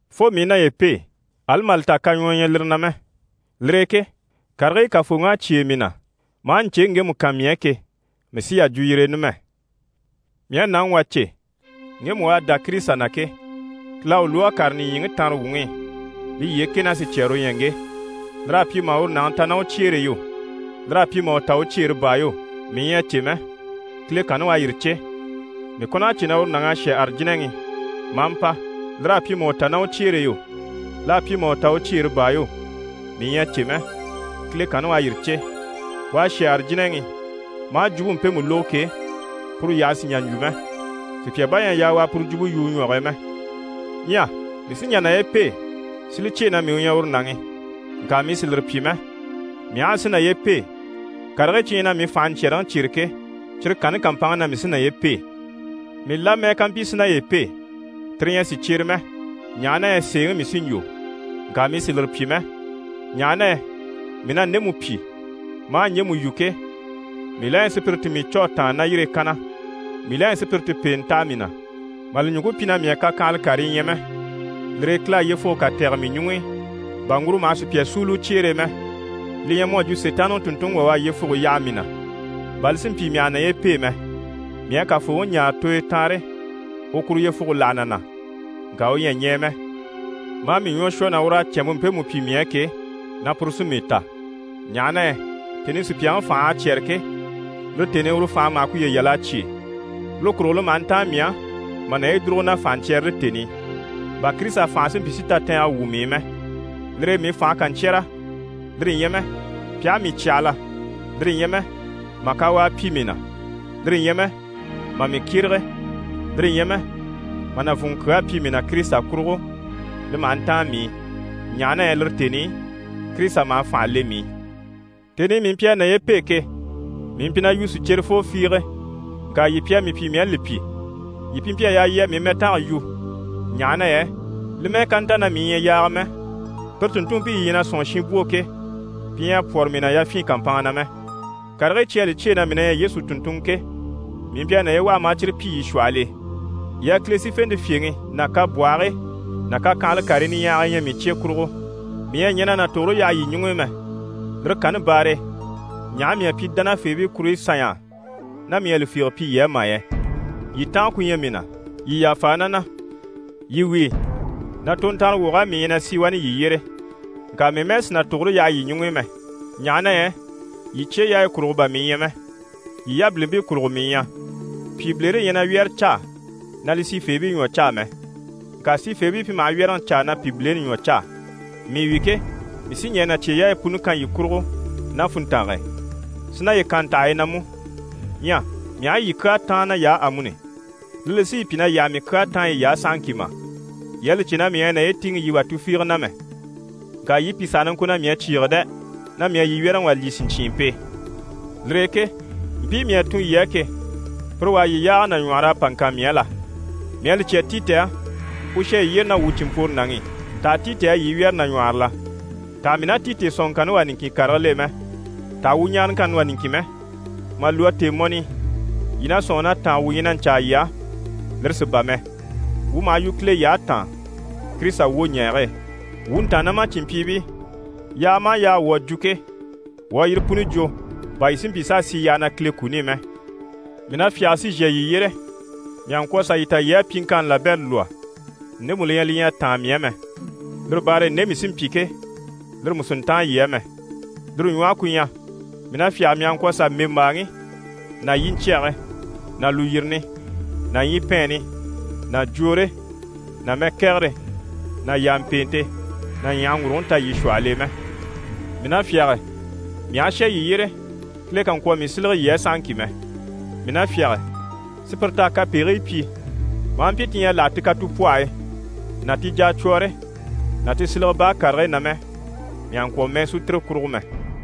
Fo mii i naye pêe, ali mà li ta kaɲwɔɔ ɲyɛ lire na mɛ. Lire e ke karigii Kafooŋi à cyêe mii na, maa ɲcèŋi ŋgemu kan mii á ke, mii sí yà jwo yire e numɛ. Mii à nàŋi wà cè, ŋgemu u à dá Kirisita na ke, Kile à u lwɔ́ a kàre nìɲyiŋi tanrewuŋi i, li yyee kɛ ná sicyɛɛre u ɲyɛ ŋge. Lir'à pyi mà uru nàŋi ta ná u cyeere e yo, l'à pyi mà u ta u cyeere baa yo, mii ɲyɛ a cè mɛ, Kile kanni u à yire cè. Mii kɔn'à cè na uru nàŋ'à shà Arijinaŋi i maa mpa. Lir'à pyi mà u ta ná u cyeere e yo, l'à pyi mà u ta u cyeere baa yo, mii ɲyɛ a cè mɛ, Kile kanni u à yire cè. U à shà Arijinaŋi i maa jwumpe mpemu lógo ke, puru yyaha sì n‑jà n‑jwo mɛ, sùpya bà ɲyɛ a yaa u a puru jwumpe yu u ɲwɔge e mɛ. Ɲyɛ mii sí n‑jà naye pêe si li cyêe na mii u ɲyɛ uru nàŋi, ŋka mii sì lire pyi mɛ. Mii aha a si naye pêe, karigii cyi ɲyɛ na mii fànhe ɲcyɛ̀rɛŋi cyêre ke, cyire kanni kàmpanŋke na mii sí naye pêe. Mii la mɛ́ɛ ká mpyi si naye pêe, tire ɲyɛ sìcyere mɛ, ɲaha na yɛ sèeŋi mii sí n‑jwo. Ŋka mii sì lire pyi mɛ, ɲaha na yɛ mii na ndemu pyi, maa ɲjemu yu ke, mii la na ɲyɛ sùpyire ti mii cû a tàanna ná yire e kanna. Mii la ɲyɛ sùpyire ti pèenɛ taha mii na, mà li ɲùŋke pyi na mii à kakyanhala karii ɲya mɛ. Lire e Kile à yyefuge kà tɛ̀gɛ mii ɲuŋ'i, bà ŋguro maha sùpya súuli u cyeere e mɛ. Li ɲyɛ mu à jwo Sitaanniŋi tùnntunŋi wà u à yyefuge yaha mii na, bà li si mpyi, mii àha naye pêe mɛ. Mii à Kafooŋi ɲáare tooyo taanre, u kuru yyefuge láha na na, ŋka u ɲyɛ a ɲɛɛ mɛ, maa mii ɲwɔ shwɔ na ur'à cɛ̀nmpe mpemu pyi mii á ke, na puru sí mii ta, ɲaha na yɛ tèni i sùpyaŋi fành'à cyɛ́rɛ ke, lire tèni i uru fànhe maha kuye yal'a cyêe. Lire kurugo li maha ntáan mii á mà naye dùrugo na fànhaɲcyɛrɛre tèni i, bà Kirisita fànhe si mpyi si tatɛɛngɛ wwû mii i mɛ. Lire e mii fànhe ká ɲcyɛ́rɛ, lire ɲyɛ mɛ pi aha mii cyahala, lire ɲyɛ mɛ mà kawaa pyi mii na, lire ɲyɛ mɛ mà mii kyérege, lire ɲyɛ mɛ mà nàvunŋɔ kyaa pyi mii na Kirisita kurugo, li maha ntáan mii i, ɲaha na yɛ lire tèni i Kirisita maha u fànhe le mii i. Tèni i mii mpyi a naye pêe ke, mii mpyi na yu sicyerefoo fiige, ŋka yii pi à mii pyi mii à li pyi. Yii pi mpyi a yaa yii a mii mɛtange yu, ɲaha na yɛ li mɛ́ɛ ká nta na mii ɲyɛ yaaga mɛ, pire tùnntunmpii yii ɲyɛ na sɔ̂nŋi shinbwoo ke, pi ɲyɛ a pwɔ́rɔ mii na yafyin kàmpanŋa na mɛ. Karigii cyi à li cyêe na mii na ɲyɛ Yesu tùnntunŋɔ ke, mii mpyi a naye waha maa cyire pyi yii shwɔhɔl'e. Yii à Kile sífente fyèŋi ná kabwɔhigii ná kakyanhala karii niɲyahagii ɲya mii cye kurugo. Mii ɲyɛ a na tugure yaha yii ɲuŋ'i mɛ, lire kanni baare e, ɲaha mii à pyi dánafeebii kuruɲyi sanɲy'á ná mii ɲyɛ a li fiige pyi yii á mà yɛ? Yii tànga ku ɲyɛ mii na, yii yàfa na na. Yii wíi, na tontanrewog'á mii ɲyɛ na sì wani yii yyére, ŋka mii mɛ́ɛ sì na tugure yaha yii ɲuŋ'i mɛ, ɲaha na yɛ yii cyeyaayi kurugo bà mii ɲyɛ mɛ, yii yabilimpii kurugo mii ɲyɛ. Pyìbilere ɲyɛ na wyɛ́rɛ caa na li sifeebii ɲwɔ caa mɛ, ŋka sifeebii pi maha wyɛ́rɛŋi caa na pyìbileni ɲwɔ caa. Mii wi ke, mii sí ɲɛɛ na cyeyaayi puni kan yii kurugo ná funntange e, si naye kan ntaha yi na mú. Ɲyɛ mii aha yii kyaa táan nay'á amuni, lire li sí yii pyi na yii àha mii kyaa táan yiy'á sahaŋki mà? Yii à li cè na mii ɲyɛ a naye tíiŋɛ wà tufiige na mɛ, ŋka yii pìi saha na ŋko na mii à cyìige dɛ, na mii à yii wyɛ́rɛŋi wà lyî sìɲcyiimpe e. Lire e ke mpii mii à tun yii á ke, pire wà à yii yaaga nàɲwɔhɔr'a pa ŋkan mii á la? Mii à li cya Titi á, u shà yii yyére ná wuu cìnmpworonaŋi i. Taha Titi à yii wyɛ́rɛ nàɲwɔhɔrɔ la? Taha mii ná Titi sɔ̀nŋɔŋkanni wá niŋkin karigil'e mɛ? Taha wuu ɲaaraŋkanni wá niŋkin mɛ? Mà lwɔ́ tèemɔni i, yii na sɔ̂nŋi na tànga wuu ɲyɛ na ɲcaa yii á, lire sí bà mɛ. Wuu maha yu Kile yyahe taan, Kirisita wwoɲɛɛge e. Wuu ntàannamacinmpyiibii, yaaga maha yaaga wuu à jwo ke, wuu à yire puni jwo, bà yii si mpyi s'a sì yyaha na Kile kuni i mɛ. Mii na fyáge si zhà yii yyére, mii àha ŋkwɔ̀ sà yii ta yii à pyiŋkanni labɛrɛ lwɔ́ ndemu li ɲyɛ li ɲyɛ a táan mii á mɛ. Lire baare e nde mii sí n‑pyi ke, lire mú sì n‑táan yii á mɛ. Lire ɲwɔhe ku ɲyɛ, mii na fyáge, mii àha ŋkwɔ̀ zà mbèmbaaŋi ná yiɲcyɛge ná lùyirini ná ɲyipɛɛnni ná jwoore ná mɛkɛgɛre ná yàmpeente ná ɲyàhaŋguruguŋi ta yii shwɔhɔl'e mɛ. Mii na fyáge, mii aha shà yii yyére, Kile kà ŋkwɔ̀ mii sílege yii á sahaŋki mɛ. Mii na fyáge, sùpyire t'à kapegigii pyi, maa mpyi ti ɲyɛ a láha ti katupwɔhɔyi ná ti jacwɔɔre ná ti silege baa karigii na mɛ, mii àha ŋkwɔ̀ mɛɛ sú tire kurugo mɛ.